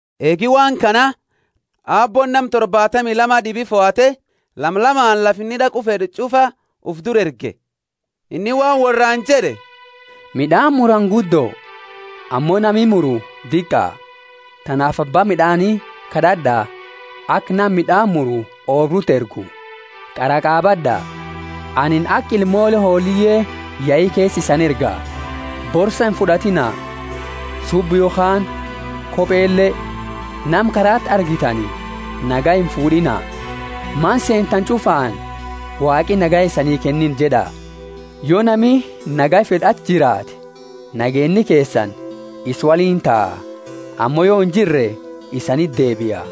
Eegi waan kana Aabbooni nama torbaatami lama d'ibi fohate, lama lamaani lafa inni d'aqu fed'u ch'ufa ufi dura erge. Inni waan worraani jed'e, Mid'aani murani guddo, ammo nami muru diqa; tanaafi abba mid'aani kad'ad'a, aka nama mid'aani muru oobruti ergu. Kara qabad'a, anini aka ilmoole hooliye yeyi keesa isani erga. Borsa imfud'atiina, subba yokhaani kopele, nama karaati argitani nagaya imfud'iina. Mana seentani ch'ufaani, Waaqi nagaya isani kenniina jed'a. Yo nami nagaya fed'u achi jiraate, nageenni keesani isa woliini taa; ammo yo injirre isaniti deebia.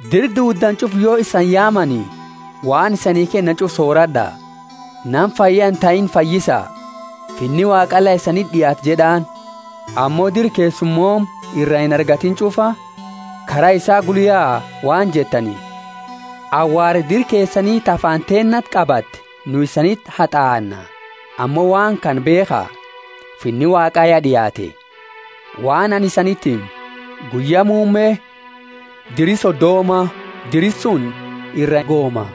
Dira duuddani ch'ufa yo isani yaamani, waan isanii kennani ch'ufa soorad'a; nama fayya intahiini fayyisa, Finni Waaqa la isaniti d'iaate jed'aani. Ammo dira keessumooma ira inargatiini ch'ufa, kara isa gula yaa, waan jettani, Awaara dira keesani ta faana teennati qabatte nu isaniti hat'aanna; ammo waan kana beekha, Finni Waaqa ya d'iaate. Waan anini isaniti himu, Guyya Muumme diri Sodoma dira suni ira gooma.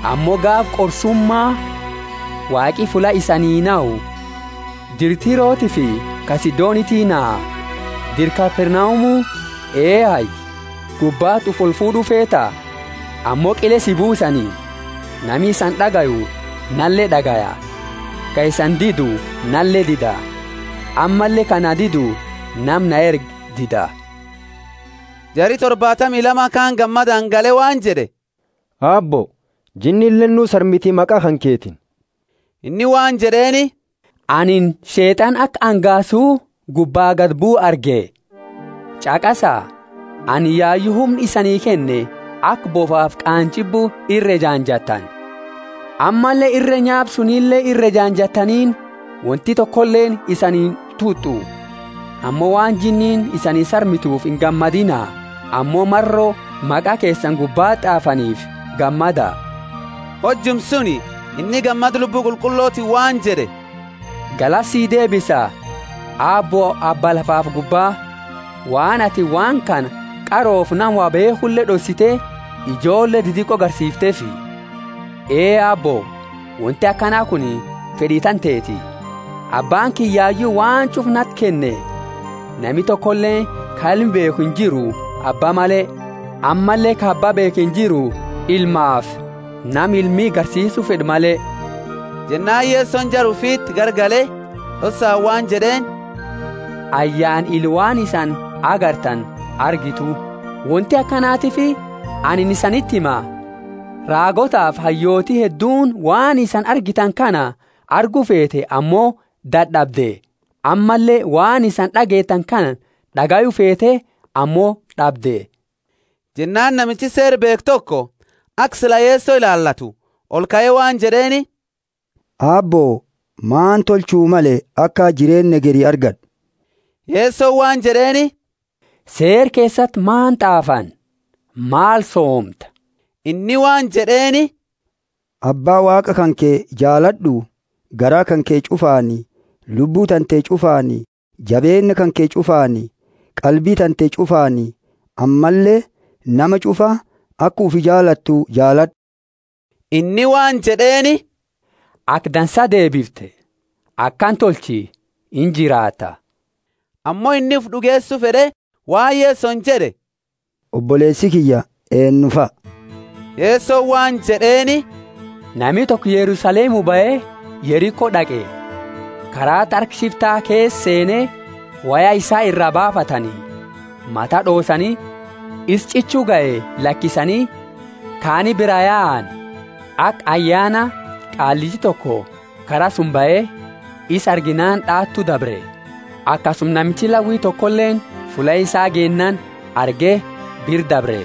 Ammo gaafa qorsuma Waaqi fulla isaanii nahu, dira Tirotiifi ka Sidoniti naha. Dira Kapernaumu, ehayi, gubbati ufi olfuud'u feeta? Ammo qile si buusani! Nami isani d'agayu nale d'agaya, ka isani didu nale dida; ammalle ka na didu nama na erge dida. Jari torbaatami Lamaani kaani gammadaani gale waan jed'e Aabbo, jinnileeni nuu sarmiti maqa kanketiini. Inni waan jed'eeni, Anini Sheet'ana aka angaasu gubba gadi buu arge. Ch'aqasa anini yayu humna isanii kenne aka bofafi qaanjibu ira ejaanjatani, ammalle irre nyaapa sunile ira ejaanjateniini; wonti tokoleeni isani intut'u. Ammo waan jinniini isani sarmitufi ingammadina, ammo maro maqa keesani gubbati t'aafanifi gammada. Hojuma suni inni gammada Lubbu Qulqullotiini waan jed'e, Galata si deebisa, Aabbo, Abba lafafi gubba, waan atini waan kana qarofi nama wo beekhu d'ossite ijoolle didiqo garsiifteefi. Ee, Aabbo, wonti akana kuni fed'i tanteti. Abbaani kiyya yayu waan ch'ufa nati kenne: nami tokoleeni ka Ilma beekhu injiru Abba male, ammalle ka Abba beekhu injiru Ilmaafi nama Ilmi garsiisu fed'u male. Jennaani Yesoni jara ufiti garagale d'ossaani waan jed'eeni, Ayyaana ila waan isani argitani argatu. Wonti akanatiifi anini isaniti hima, raagootafi hayyooti hedduuni waan isani argitani kana argu feete ammo d'ad'abde, ammalle waan isani d'ageetani kana d'agayu feete ammo d'abde. Jennaani namichi Seera beekhu toko, aka sila Yeso ilaalatu, olkae waan jed'eeni, Aabbo, maal tolchu male aka jireenna hegeri argad'u? Yesoni waan jed'eeni, Seera keesati maal t'aafani? Maal soomta? Inni waan jed'eeni, Abba Waaqa kanke jaalad'u, garaa kanke ch'ufaani, lubbu tante ch'ufaani, jabeenna kanke ch'ufaani, qalbi tante ch'ufaani; ammalle nama ch'ufa aka ufi jaalatu jaalad'u. Inni waan jed'eeni, Aka dansa deebifte, akana tolchi, injiraata. Ammo inni ufi d'ugeesu fed'e waan Yesoni jed'e, Oboleesi kiyya eenufa? Yesoni waan jed'eeni, Nami toko Yerusalemu bahe Yeriko d'aqe; karaati harka shifta keesa, seene, woya isa ira baafatani, mata d'oosani, isa ch'ichu gahe lakisani kaani biraa yaani. Aka ayyaana qaallichi toko kara suni bahe; isa arginaani d'aatu dabre. Akasuma namichi Lawi tokoleeni fulla isaa geennaani arge bira dabre.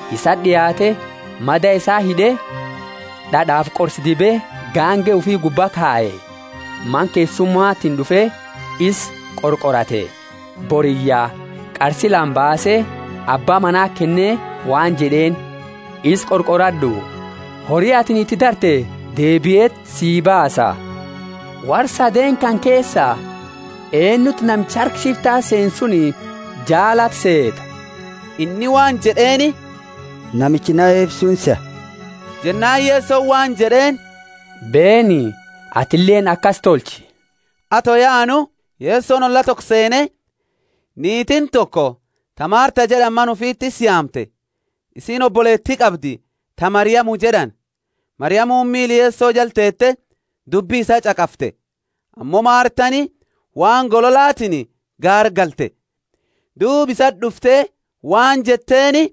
Isati d'iaate, mada isaa hid'e, d'ad'afi qorsa dibe gaange ufi gubbaa kaye, Mana keessumatini d'ufe isa qorqorate. Boriyya qarsi lama baase abba manati kenne waan jed'eeni, isa qorqorad'u, hori atini iti darte deebieti sii baasa. Worra sadeeni kana keesa eenuti namicha harka shifta seene suni jaalate seeta? Inni waan jed'eeni, Namicha naheefi suni seha. Jennaani Yesoni waan jed'eeni, Beeni, atileeni akasi tolchi. Ato yaanu, Yesoni olla toko seene; niitiini toko ta Martha jed'ani mana ufiti isa yaamte. Isiini oboleeti qabdi ta Mariamu jed'ani; Mariamuni miila Yeso jala teete dubbi isaa ch'aqafte. Ammo Marthani waan gololaatiini gaargalte; duuba isati d'ufte waan jetteeni,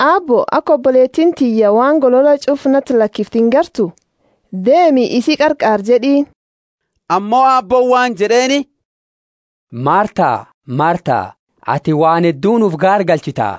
Aabbo, aka oboleetiini tiyya waan golola ch'ufa nati lakifte ingartu? Deemi isi qarqaari jed'iini. Ammo Aabbooni waan jed'eeni, Martha, Martha, atini waan hedduuni ufi gaargalchita,